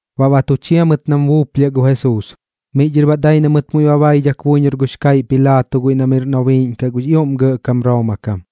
Baꞌ ba tu chia mɨt nam buuplhiaꞌ gu Jesuus, miꞌ dhɨr baꞌ dai na mɨt muiꞌ ba baidhak buiñor gux kaiꞌ Pilaato guiꞌ na miꞌr nobiiꞌñ gux ioꞌm gɇꞌkam Rooma kam.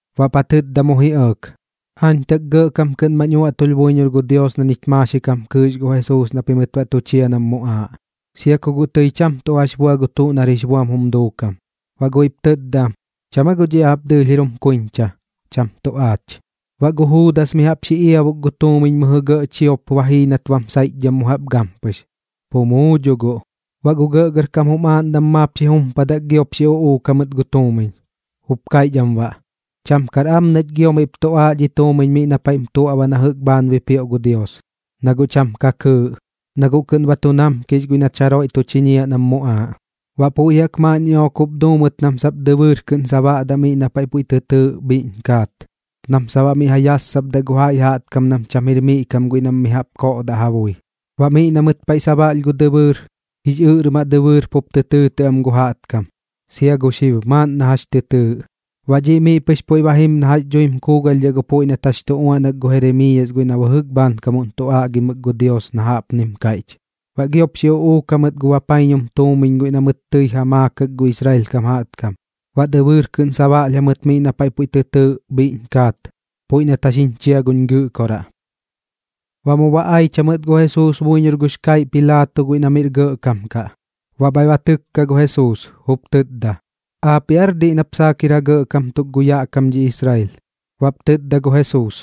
Baꞌp ja tɨtda mu ji ɇɇk: ―Aañ tak gɇꞌkam kɨꞌn mañ uaꞌtulh buiñor gu Dios na ñich maaxik jam kɨɨx gu Jesuus na pim baꞌ tu chiñiaꞌ nam muꞌaaꞌ, sia ku guꞌ tɨi cham tuꞌ jax bua gu tuꞌ nar jix buam jum duukam. Baꞌ guiꞌp tɨtda am: ―¿Cham aa guꞌ dhiꞌ aap dɨɨlh jir jum kuiñcha, cham tuꞌ aach? Baꞌ gu Juudas mi jaꞌp xi iabuk gu tuumiñ mɨjɨ gɇꞌ chiop ba jii nat bam saiꞌchdham mu jaꞌp gampɨx, pu muu dho guꞌ. Baꞌ gu gɇꞌgɇrkam jum aaꞌndam maap xi jumpadak giop xi uꞌuuk jamɨt gu tuumiñ, jup kaiꞌch am baꞌ: ―Cham kar am nach gio miꞌp tuꞌaaꞌ dhi tuumiñ miꞌ na paiꞌm tuaꞌba na jɨꞌk bhaan bipioꞌ gu Dios, na guꞌ cham ka kɨɨꞌ, na guꞌ kɨꞌn ba tu namkix guiꞌ nach jaroiꞌ tu chiñiaꞌ nam muꞌaaꞌ. Baꞌ puiꞌ jaꞌk maaꞌn ñiꞌook jup duu mɨt nam sap dɨbɨɨr kɨꞌn sabaꞌdaꞌ miꞌ na paiꞌ puiꞌ tɨ tɨɨꞌ Bhiꞌñ Kaat, nam sap baꞌ miꞌ ja yassapdaꞌ gu jaiꞌ jaꞌtkam nam cham jir miꞌ kam kaꞌ guiꞌ nam mi jaꞌp koꞌdaꞌ ja bui. Baꞌ miꞌ na mɨt paiꞌ sabaꞌlh gu dɨbɨɨr, Jix Ɨꞌrmaꞌ Dɨbɨɨr pup tɨ tɨɨtɨꞌ am gu jaꞌtkam, sia gu xib maaꞌn nam jax tɨ tɨɨtɨꞌ. Baꞌ dhiꞌ miꞌ pɨx puiꞌ ba jim na jax dhuim kuugalhdhaꞌ gu puiꞌ nat jax jaꞌk tu uaꞌnak gu Jeremiiyas guiꞌ na bɨjɨk bhaankam tu aꞌgimɨk gu Dios na jaꞌpnim kaiꞌch: “Baꞌ giop xi uꞌuuk jamɨt gu bapaiñum tuumiñ guiꞌ na mɨt tɨi ja maakak gu Israel kam jaꞌtkam, baꞌ dɨbɨɨr kɨꞌn sabaꞌlh jamɨt miꞌ na paiꞌ puiꞌ tɨ tɨɨꞌ Bhiꞌñ Kaat puiꞌ nat jax jiñ chia guñ Gɨꞌkoraꞌ.” Baꞌ mu ba aich jamɨt gu Jesuus buiñor gux kaiꞌ Pilaato guiꞌ na miꞌr gɇꞌkam kaꞌ. Baꞌ bhaiꞌ ba tɨkka gu Jesuus, jup tɨtda: ―¿Aapiꞌ aar diꞌ nap saak jir ja gɇꞌkam tuk gu yaꞌ kam dhi Israel? Baꞌp tɨtda gu Jesuus: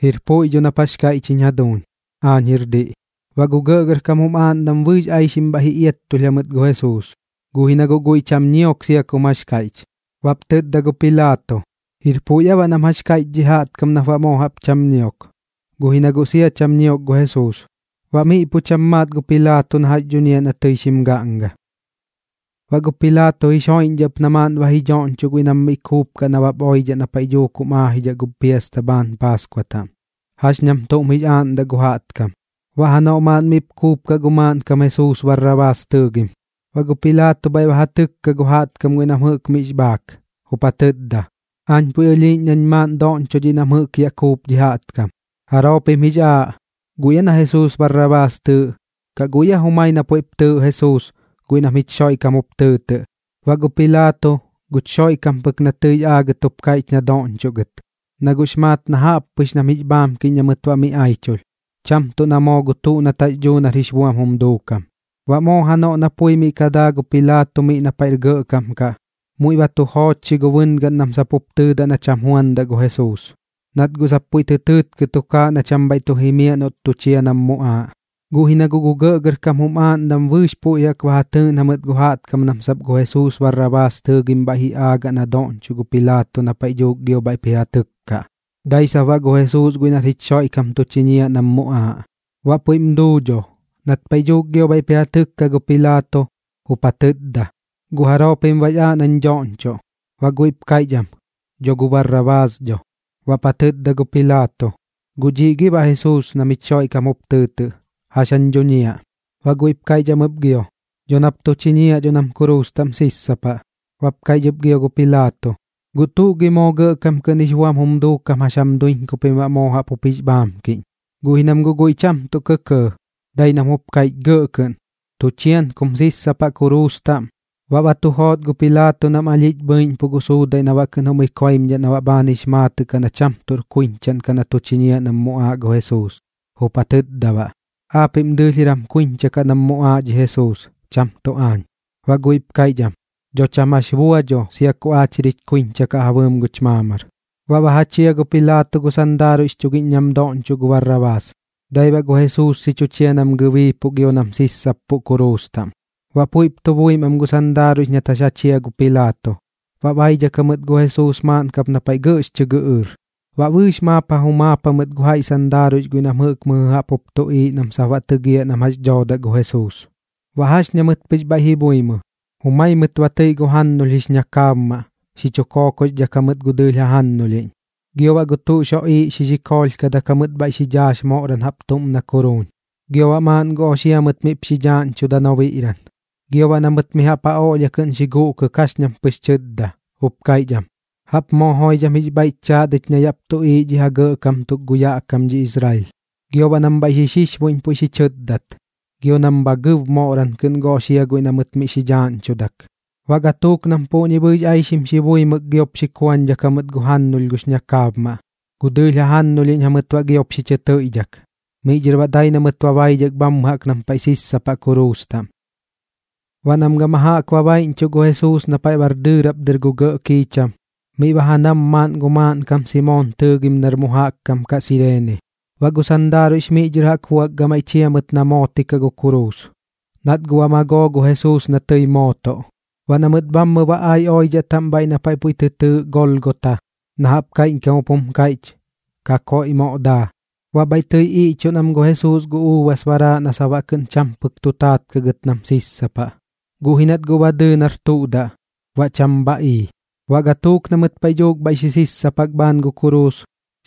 ―Jir puiꞌ dho nap jax kaiꞌch jiñ jaduuñ. Aañ jir diꞌ. Baꞌ gu gɇꞌgɇrkam jum aaꞌndam bɨɨx aixim bhaiꞌ ji iattulh jamɨt gu Jesuus, guꞌ ji na guꞌ guiꞌ cham ñiok sia kum jax kaiꞌch. Baꞌp tɨtda gu Pilaato: ―¿Jir puiꞌ aa baꞌ nam jax kaiꞌch dhi jaꞌtkam nap baꞌ moo jaꞌp cham ñiok? Guꞌ ji na guꞌ sia cham ñiok gu Jesuus. Baꞌ miꞌ pu cham maat gu Pilaato na jax dhuñiaꞌ na tɨi xim gaꞌnga. Baꞌ gu Pilaato jix joiꞌñdhaꞌ ɨp na maaꞌn ba ji dhoꞌñchoꞌ guiꞌ nam mi kuupkaꞌ nabap maaꞌn oidhaꞌ na paiꞌ dhuuk jum aajidhaꞌ gu piasta bhaan Paaskua taꞌm, jax ñam tuꞌm jix aaꞌndaꞌ gu jaꞌtkam. Baꞌ janoꞌ maaꞌn miꞌp kuupkaꞌ gu maaꞌnkam Jesuus Barrabaas tɨɨgim. Baꞌ gu Pilaato bhaiꞌ ba ja tɨkka gu jaꞌtkam guiꞌ nam jɨꞌk miꞌx bhaak, jup ja tɨtda: ―Aañ puiꞌ ɨlhiiꞌñ nañ maaꞌn doꞌñchoꞌ dhiꞌ nam jɨꞌk yaꞌ kuup dhi jaꞌtkam. ¿Jaroo pim jix aaꞌ, guiꞌ aa na Jesuus Barrabaas tɨɨꞌ, kaꞌ guiꞌ aa jumai na puiꞌp tɨɨꞌ Jesuus guiꞌ nam jich Xoiꞌkam jup tɨɨtɨꞌ? Baꞌ gu Pilaato, guch Xoiꞌkam pɨk na tɨix aagɨt jup kaiꞌch na doꞌñchoꞌ gɨt, na guꞌx bhaiꞌx maat na jaꞌp pɨx nam jix bhaamkiꞌñ na mɨt baꞌ mi aichulh, cham tuꞌ na moo gu tuꞌ nat jax dhuu nar jix buam jum duukam. Baꞌ moo janoꞌ na pui miꞌ ka daa gu Pilaato miꞌ na paiꞌr gɇꞌkam kaꞌ, muiꞌ ba tu joochxi gu bɨngaꞌn nam sap jup tɨɨdaꞌ na cham juandaꞌ gu Jesuus, nat guꞌ sap puiꞌ tɨ tɨɨtkɨ tukaaꞌ na cham bhaiꞌ tu jimiaꞌ noꞌt tu chia nam muꞌaaꞌ. Guꞌ ji na guꞌ gu gɇꞌgɇrkam jum aaꞌndam bɨɨx puiꞌ jaꞌk ba ja tɨɨꞌn jamɨt gu jaꞌtkam nam sap gu Jesuus Barrabaas tɨɨgim bhaiꞌ ji aagaꞌ na doꞌñchoꞌ gu Pilaato na paiꞌ dhuuk gio bhaiꞌp ji ja tɨkkaꞌ, dai sap baꞌ gu Jesuus guiꞌ nar jich Xoiꞌkam tu chiñiaꞌ nam muꞌaaꞌ. Baꞌ puiꞌm duu dho, nat paiꞌ dhuuk gio bhaiꞌp ji ja tɨkka gu Pilaato, jup ja tɨtda: ―¿Guꞌ jaroo pim bax aaꞌ nañ doꞌñchoꞌ? Baꞌ guiꞌp kaiꞌch am: ―Dho gu Barrabaas dho. Baꞌp ja tɨtda gu Pilaato: ―¿Guꞌ dhiꞌ gi baꞌ Jesuus nam jich Xoiꞌkam tɨɨtɨꞌ, jax jañ dhuñiaꞌ? Baꞌ guiꞌp kaiꞌch am ɨp gio: ―Dho nap tu chiñiaꞌ dho nam kuruus taꞌm sissapaꞌ. Baꞌp kaiꞌch ɨp gio gu Pilaato: ―¿Guꞌ tuꞌ gi moo gɇꞌkam kɨꞌn jix buam jum duukam jax jam duiñ ku pim baꞌ moo jaꞌp jup jix bhaamkiꞌñ? Guꞌ ji nam guꞌ guiꞌ cham tuꞌ kɇkɇɇ, dai nam jup kaiꞌch gɇꞌ kɨꞌn: ―¡Tu chian kum mu sissapaꞌ kuruus taꞌm! Baꞌ ba tu joot gu Pilaato nam alhiꞌch bhɨiꞌñpuꞌ gu suudaiꞌ na baꞌ kɨꞌn jum ikoimdhaꞌ na bhaan jix maatɨꞌ kaꞌ na cham tuꞌr kuiñchaꞌn kaꞌ na tu chiñiaꞌ nam muꞌaaꞌ gu Jesuus, jup ja tɨtda baꞌ: ―Aapiꞌm dɨɨlh jir jam kuiñcha kaꞌ nam muꞌaaꞌ dhi Jesuus, cham tuꞌ aañ. Baꞌ guiꞌp kaiꞌch am: ―Dho cham jax bua dho sia ku aach jir jich kuiñcha kaꞌ ja bɨɨm guch maamar. Baꞌ ba ja chia gu Pilaato gu sandaaruiꞌx chugiꞌñ nam doꞌñchoꞌ gu Barrabaas, dai baꞌ gu Jesuus xi chu chia nam gɨbiipuꞌ gio nam sissappuꞌ kuruus taꞌm. Baꞌ puiꞌp tu buim am gu sandaaruiꞌx nat jax ja chia gu Pilaato, ba baidhak jamɨt gu Jesuus maaꞌn kap na paiꞌ gɇꞌx chɨ gɨꞌɨɨr. Baꞌ bɨɨx maap ba ja jumaap jamɨt gu jaiꞌ sandaaruiꞌx guiꞌ nam jɨꞌk mɨjɨ jaꞌp jup tuꞌiiꞌ nam sap baꞌ tɨgiaꞌ nam jax dhoodaꞌ gu Jesuus. Baꞌ jax ña mɨt pɨx bhaiꞌ ji buimɨ, jumai mɨt ba tɨiꞌ gu jannulh jix ñakaabmaꞌ xi chu kookoxdhak jamɨt gu dɨɨlh jajannulhiꞌñ. Gio baꞌ gu tuꞌx joꞌiiꞌ xi xikoolhkadak jamɨt bhaiꞌ xi dhaax moꞌran jaꞌp na kuruun, gio baꞌ maaꞌn gu oxia mɨt miꞌp xi dhaaꞌñchuda nobiꞌran. Gio baꞌ na mɨt mi jaꞌp ja oꞌlhia kɨꞌn xi guꞌkɨk jax ñam pɨx tɨtda, jup kaiꞌch am: ―¡Jaꞌp moo joidham jix bhaiꞌch chaat ich na yaꞌp tuꞌiiꞌ dhi ja gɇꞌkam tuk gu yaꞌ kam dhi Israel! Gio baꞌ nam bhaiꞌ xi xixbuiꞌñ puiꞌ xi chɨtdat, gio nam bha gɨb moꞌran kɨꞌn gu oxia guiꞌ na mɨt miꞌ xi dhaaꞌñchudak. Baꞌ gatuuk nam puꞌñi bɨɨx aixim xi buimɨk giop xi kuañdhak jamɨt gu jannulh gux ñakaabmaꞌ, gu dɨɨlh jajannulhiꞌñ jamɨt baꞌ giop xi chɨ tɨiꞌdhak. Miꞌ dhɨr baꞌ dai na mɨt ba baidhak bhammɨ jaꞌk nam paiꞌ sissapaꞌ kuruus taꞌm. Baꞌ nam gama jaꞌk ba baiꞌñchuꞌ gu Jesuus na paiꞌ bar dɨɨrap dɨr miꞌ gu gɇꞌ kiicham, miꞌ ba ja nam maaꞌn gu maaꞌnkam Simoon tɨɨgim nar mu jaꞌk kam kaꞌ Sireene. Baꞌ gu sandaaruiꞌx miꞌ dhɨr jaꞌk buak gamaiꞌ chia mɨt na mootikaꞌ gu kuruus, nat guꞌ ba magoo gu Jesuus na tɨi mootoꞌ. Baꞌ na mɨt bhammɨ ba ai oidhaꞌ taꞌm bhaiꞌ na paiꞌ puiꞌ tɨ tɨɨꞌ Golgota, na jaꞌp kaiꞌñkam jup jum kaiꞌch: Kakoiꞌ Moꞌ Daa, baꞌ bhaiꞌ tɨi iꞌchuꞌn am gu Jesuus gu uubas baraaꞌ na sap baꞌ kɨꞌn cham pɨk tu taat kaꞌ gɨt nam sissapaꞌ, guꞌ ji nat guꞌ ba dɨɨ nar tuꞌ daꞌ, baꞌ cham bha ii. Baꞌ gatuuk na mɨt paiꞌ dhuuk bhaiꞌ xi sissapak bhaan gu kuruus,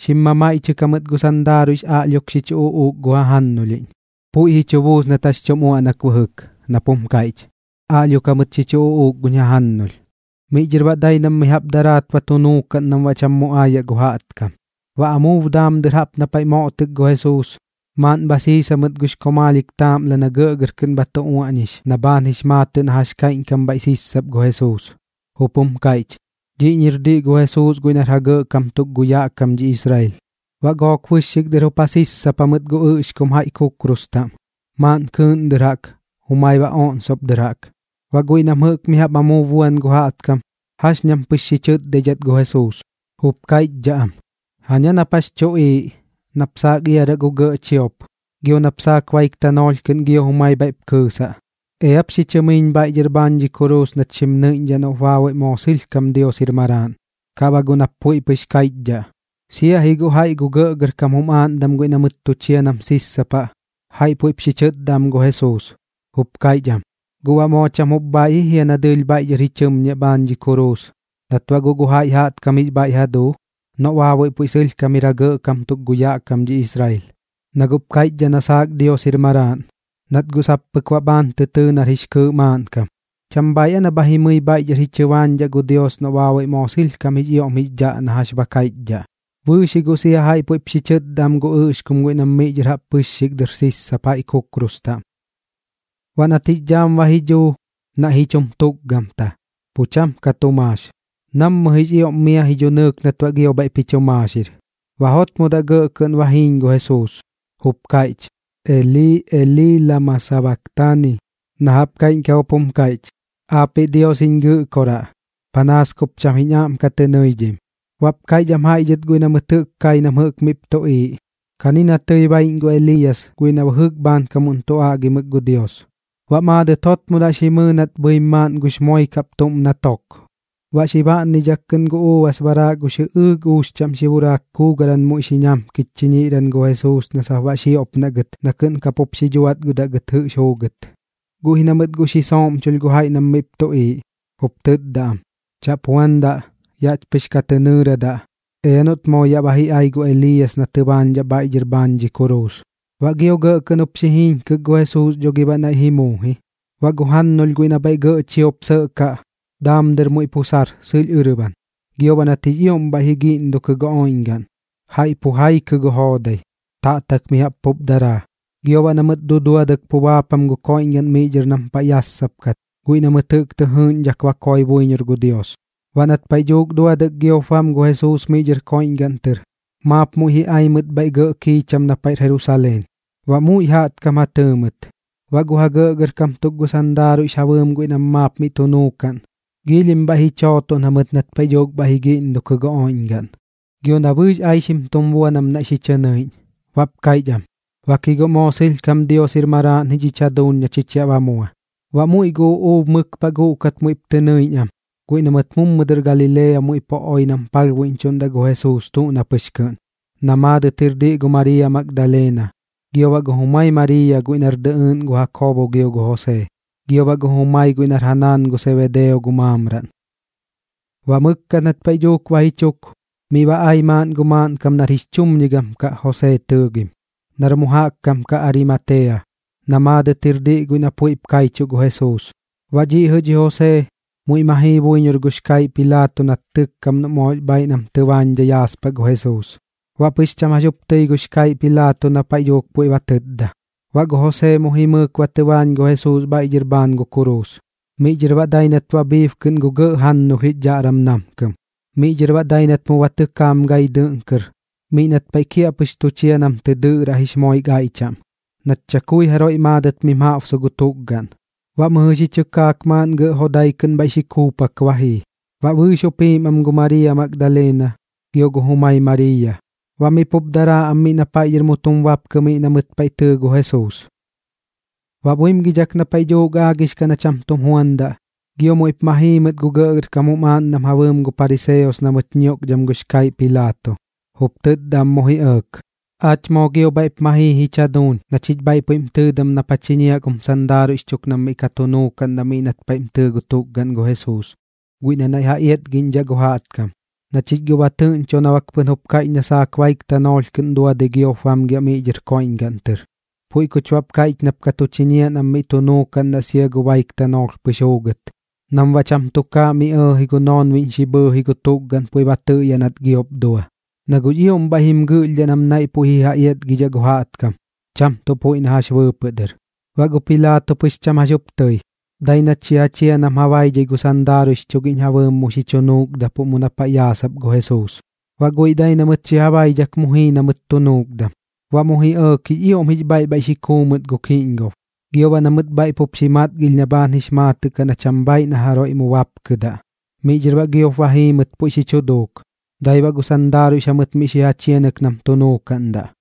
xim mamaiꞌchɨk jamɨt gu sandaaruiꞌx aꞌlhiok xi chu uꞌuuk gu jajannulhiꞌñ. Puiꞌ ji chu buus nat jax tum uaꞌnak bɨjɨk, nap jum kaiꞌch: “Aꞌlhiok jamɨt xi chu uꞌuuk guñ jajannulh.” Miꞌ dhɨr baꞌ dai nam mi jaꞌp daraat ba tu nuukaꞌn nam baꞌ cham mu aayaꞌ gu jaꞌtkam. Baꞌ amuub daam dɨr jaꞌp na paiꞌ moꞌtɨk gu Jesuus, maaꞌn bha siis jamɨt gux komaalhik taaꞌmla na gɇꞌgɇr kɨꞌn bha tu uaꞌñix na bhaan jix maatɨꞌ na jax kaiꞌñkam bhaiꞌ sissap gu Jesuus, jup jum kaiꞌch: “Dhiꞌñir diꞌ gu Jesuus guiꞌ nar ja gɇꞌkam tuk gu yaꞌ kam dhi Israel.” Baꞌ gook bɨxxik dɨr jup ja sissapa mɨt gu ɨꞌxkum jaiꞌ kukrus taꞌm, maaꞌn kɨɨꞌn dɨr jaꞌk, jumai baꞌ oꞌnsop dɨr jaꞌk. Baꞌ guiꞌ nam jɨꞌk mi jaꞌp amuub buan gu jaꞌtkam, jax ñam pɨx xi chɨtdaidhat gu Jesuus, jup kaiꞌchdhaꞌ am: ―¡Jaña nap jax chuꞌiiꞌ! Nap saak iaraꞌ gu gɇꞌ chiop, gio nap saak baik tanoolh kɨꞌn gio jumai bhaiꞌp kɨɨsaꞌ. Eap xi chɨmiiñ bhaiꞌ dhɨr bhaan dhi kuruus nach xim nɨiꞌñdhaꞌ noꞌp baabuiꞌ moo sɨlhkam Dios jir Maraaꞌn, kaꞌ baꞌ guꞌ nap puiꞌ pɨx kaiꞌchdhaꞌ. Sia ji guꞌ jaiꞌ gu gɇꞌgɇrkam jum aaꞌndam guiꞌ na mɨt tu chia nam sissapaꞌ, jaiꞌ puiꞌp xi chɨtda am gu Jesuus, jup kaiꞌch am: ―¿Guꞌ baꞌ moo cham jup bhaiꞌ ji jia na dɨɨlh bhaiꞌ dhɨr ji chɨmñiaꞌ bhaan dhi kuruus, nat baꞌ guꞌ gu jaiꞌ jaꞌtkam jix bhaiꞌ ja duu? Noꞌ baabuiꞌ puiꞌ sɨlhkam jir ja gɇꞌkam tuk gu yaꞌ kam dhi Israel. Na guꞌp kaiꞌchdhaꞌ na saak Dios jir Maraaꞌn, nat guꞌ sap pɨk baꞌ bhaan tɨ tɨɨ nar jix kɨɨꞌ maaꞌnkam. ¿Cham bhaaiꞌ aa na bha jimɨi bhaiꞌ dhɨr ji chɨbaañdhaꞌ gu Dios noꞌ baabuiꞌ moo sɨlhkam jix ioꞌm jix dhaꞌ na jax ba kaiꞌchdhaꞌ? Bɨɨx ji guꞌ sia jaiꞌ puiꞌp xi chɨtda am gu ɨꞌxkum guiꞌ nam miꞌ dhɨr jaꞌp bɨxxik dɨr jup sissap jaiꞌ kukrus taꞌm. Baꞌ nat jix dhaam ba ji dhuu, naiꞌ ji chum tukgamta, pu cham ka tu maax, nammɨ jix ioꞌm mia ji dhunɨɨk nat baꞌ gio bhaiꞌp jix chu maaxir. Baꞌ jotmodaꞌ gɇꞌ kɨꞌn ba jiiñ gu Jesuus, jup kaiꞌch: ―Elii, Elii, ¿lama sabaktani? ―na jaꞌp kaiꞌñkam jup jum kaiꞌch: Aapiꞌ Dios jiñ Gɨꞌkoraꞌ, panaas kup cham jiñ aꞌm ka tɨ nɨidhim. Baꞌp kaiꞌch am jaiꞌ dhɨt guiꞌ na mɨt kai nam jɨꞌk miꞌp tuꞌiiꞌ: ―Kani na tɨi baiꞌñ gu Eliiyas guiꞌ na bɨjɨk bhaankam tu aꞌgimɨk gu Dios. Baꞌ maadɨt jotmodaꞌ xi mɨɨ nat bhɨim maaꞌn gux moik jaꞌp tuꞌm na tok, baꞌ xi baꞌnnidhak kɨꞌn gu uubas baraaꞌ gux jɨꞌɨɨk uux chaꞌm xi buraak kuugaran muiꞌ xi ñamkich chiñiꞌran gu Jesuus na sap baꞌ xioꞌpnaꞌ gɨt na kɨꞌn kapup xi dhuatgɨdaꞌ gɨt jɨꞌx juugɨt. Guꞌ ji na mɨt guꞌ xi sooꞌmchulh gu jaiꞌ nam miꞌp tuꞌiiꞌ, jup tɨtda am: ―Chaꞌp juandaꞌ. Yaꞌch pɨx ka tɨ nɨɨradaꞌ, ea noꞌt moo yaꞌ ba ji ai gu Eliiyas na tɨbaañdhaꞌ bhaiꞌ dhɨr bhaan dhi kuruus. Baꞌ gio gɇꞌ kɨꞌn jup xi jiiñkɨk gu Jesuus dho gi baꞌ naiꞌ ji muu ji. Baꞌ gu jannulh guiꞌ na bhaiꞌ gɇꞌ chiop sɇꞌkaꞌ, daam dɨr muiꞌ pu sar sɨlh ɨrban. Gio baꞌ nat jix ioꞌm bhaiꞌ ji giꞌndukɨ gu oiꞌñgaꞌn, jaiꞌ pu jaikɨ gu joodai, taꞌtak mi jaꞌp pup daraa. Gio baꞌ na mɨt duduadɨk pu baapam gu koiꞌñgaꞌn miꞌ dhɨr nam paiꞌ yassapkat guiꞌ na mɨt jɨꞌk tɨ jɨɨgiꞌñdhak ba koꞌɨɨk buiñor gu Dios. Baꞌ nat paiꞌ dhuuk duadɨk giop bam gu Jesuus miꞌ dhɨr koiꞌñgaꞌn tɨr, maap muiꞌ ji ai mɨt bhaiꞌ gɇꞌ kiicham na paiꞌr Jerusaleen, baꞌ muiꞌ jaꞌtkam ja tɨɨ mɨt. Baꞌ gu ja gɇꞌkam tuk gu sandaaruiꞌx ja bɨɨm guiꞌ nam maap miꞌ tu nuukaꞌn, giilhim bhaiꞌ ji chootoꞌn jamɨt nat paiꞌ dhuuk bhaiꞌ ji giꞌndukɨ gu oiꞌñgaꞌn gio na bɨɨx aixim tum bua nam naiꞌ xi chɨ nɨiꞌñ, baꞌp kaiꞌch am: ―Bak ji guꞌ moo sɨlhkam Dios jir Maraaꞌn ji dhich jaduuñ na chich yaꞌ ba mua. Baꞌ muiꞌ gu uꞌuub mɨk paꞌ guꞌkat muiꞌp tɨ nɨiꞌñ am, guiꞌ na mɨt mummɨ dɨr Galilea muiꞌ pu oi nam palhbuiꞌñchuꞌndaꞌ gu Jesuus tuꞌ na pɨx kɨꞌn, na maadɨt jir diꞌ gu Mariiya Magdaleena, gio baꞌ gu jumai Mariiya guiꞌ nar dɨꞌɨɨꞌn gu Jakoobo gio gu Josee, gio baꞌ gu jumai guiꞌ nar ja naan gu Sebedeo gu maamraꞌn. Baꞌ mɨkkat nat paiꞌ dhuuk ba ji chuk, miꞌ ba ai maaꞌn gu maaꞌnkam nar jix chumñigam kaꞌ Josee tɨɨgim, nar mu jaꞌk kam kaꞌ Arimatea, na maadɨt jir diꞌ guiꞌ na puiꞌp kaichuꞌ gu Jesuus. Baꞌ dhiꞌ jɨꞌ dhi Josee muiꞌ ma jii buiñor gux kaiꞌ Pilaato nat tɨkkam noꞌ moox bhaaiꞌ nam tɨbaañdhai yaaspaꞌ gu Jesuus. Baꞌ pɨx cham jax jup tɨi gux kaiꞌ Pilaato na paiꞌ dhuuk puiꞌ ba tɨtda. Baꞌ gu Josee mu jimɨɨk ba tɨbaañ gu Jesuus bhaiꞌ dhɨr bhaan gu kuruus, miꞌ dhɨr baꞌ dai nat ba bhiib kɨꞌn gu gɇꞌ jannulh jix dhaꞌram namkɨm. Miꞌ dhɨr baꞌ dai nat mu ba tɨkaam gai dɨꞌn kɨr miꞌ nat paiꞌ kiaꞌpɨx tu chia nam tɨ dɨꞌraꞌ jix moik aiꞌ chaꞌm, nat chakui jaroiꞌ maadɨt miꞌm jaꞌbsu gu tukgaꞌn. Baꞌ mɨjɨ xi chɨkaak maaꞌn gɇꞌ jodai kɨꞌn bhaiꞌ xi kuupak ba jii. Baꞌ bɨɨx jup jiim am gu Mariiya Magdaleena gio gu jumai Mariiya, baꞌ miꞌ pup daraa am miꞌ na paiꞌ dhɨr mu tum bapkɨ miꞌ na mɨt paiꞌ tɨɨ gu Jesuus. Baꞌ buimgidhak na paiꞌ dhuuk aagix kaꞌ na cham tum juandaꞌ, gio muiꞌp ma jii mɨt gu gɇꞌgɇrkam jum aaꞌndam ja bɨɨm gu pariseos na mɨt ñioꞌkdham gux kaiꞌ Pilaato, jup tɨtda am mu ji ɇɇk: ―Aach moo gio bhaiꞌp ma jii jich jaduuñ na chich bhaiꞌ puiꞌm tɨɨdam nap ja chiñiaꞌ gum sandaaruiꞌx chuk nam miꞌ ka tu nuukaꞌndaꞌ miꞌ nat paiꞌm tɨɨ gu tukgaꞌn gu Jesuus guiꞌ na naiꞌ ja iatgiꞌñdhaꞌ gu jaꞌtkam, na chich guꞌ ba tɨꞌñcho na bak pɨn jup kaiꞌch na sap baik tanoolh kɨꞌn duadɨi giop bamgiaꞌ miꞌ dhɨr koiꞌñgaꞌn tɨr. Puiꞌ kuch baꞌp kaiꞌch nap ka tu chiñiaꞌ nam miꞌ tu nuukaꞌndaꞌ sia gu baik tanoolh pɨx juugɨt nam baꞌ cham tukaaꞌ miꞌ ji ɇɇji gu noonbiꞌñ xi bhɨɨji gu tukgaꞌn puiꞌ ba tɨꞌyaꞌ nat giop dua. Na guꞌx ioꞌm bhaiꞌ jim gɨꞌlhdhaꞌ nam naiꞌ puiꞌ ji ja iatgidhaꞌ gu jaꞌtkam, cham tuꞌ puiꞌ na jax bɨɨpɨꞌ dɨr. Baꞌ gu Pilaato pɨx cham jax jup tɨi, dai nat xi ja chia nam ja baidhai gu sandaaruiꞌx chugiꞌñ ja bɨɨm mu xi chu nuukdapuꞌ mu na paiꞌ yaasap gu Jesuus. Baꞌ guiꞌ dai na mɨt xi ja baidhak mu jii na mɨt tu nuukdam. Baꞌ mu ji ɇɇk jix ioꞌm jix bhaiꞌ bhaiꞌ xi kuu mɨt gu kiꞌñgob, gio baꞌ na mɨt bhaiꞌ pup xi matgilh na bhaan jix maatɨꞌ kaꞌ na cham bhaiꞌ na jaroiꞌ mu jaꞌk bapkɨdaꞌ. Miꞌ dhɨr baꞌ giop ba jii mɨt puiꞌ xi chu duuk, dai baꞌ gu sandaaruiꞌx jamɨt miꞌ xi ja chianɨk nam tu nuukaꞌndaꞌ.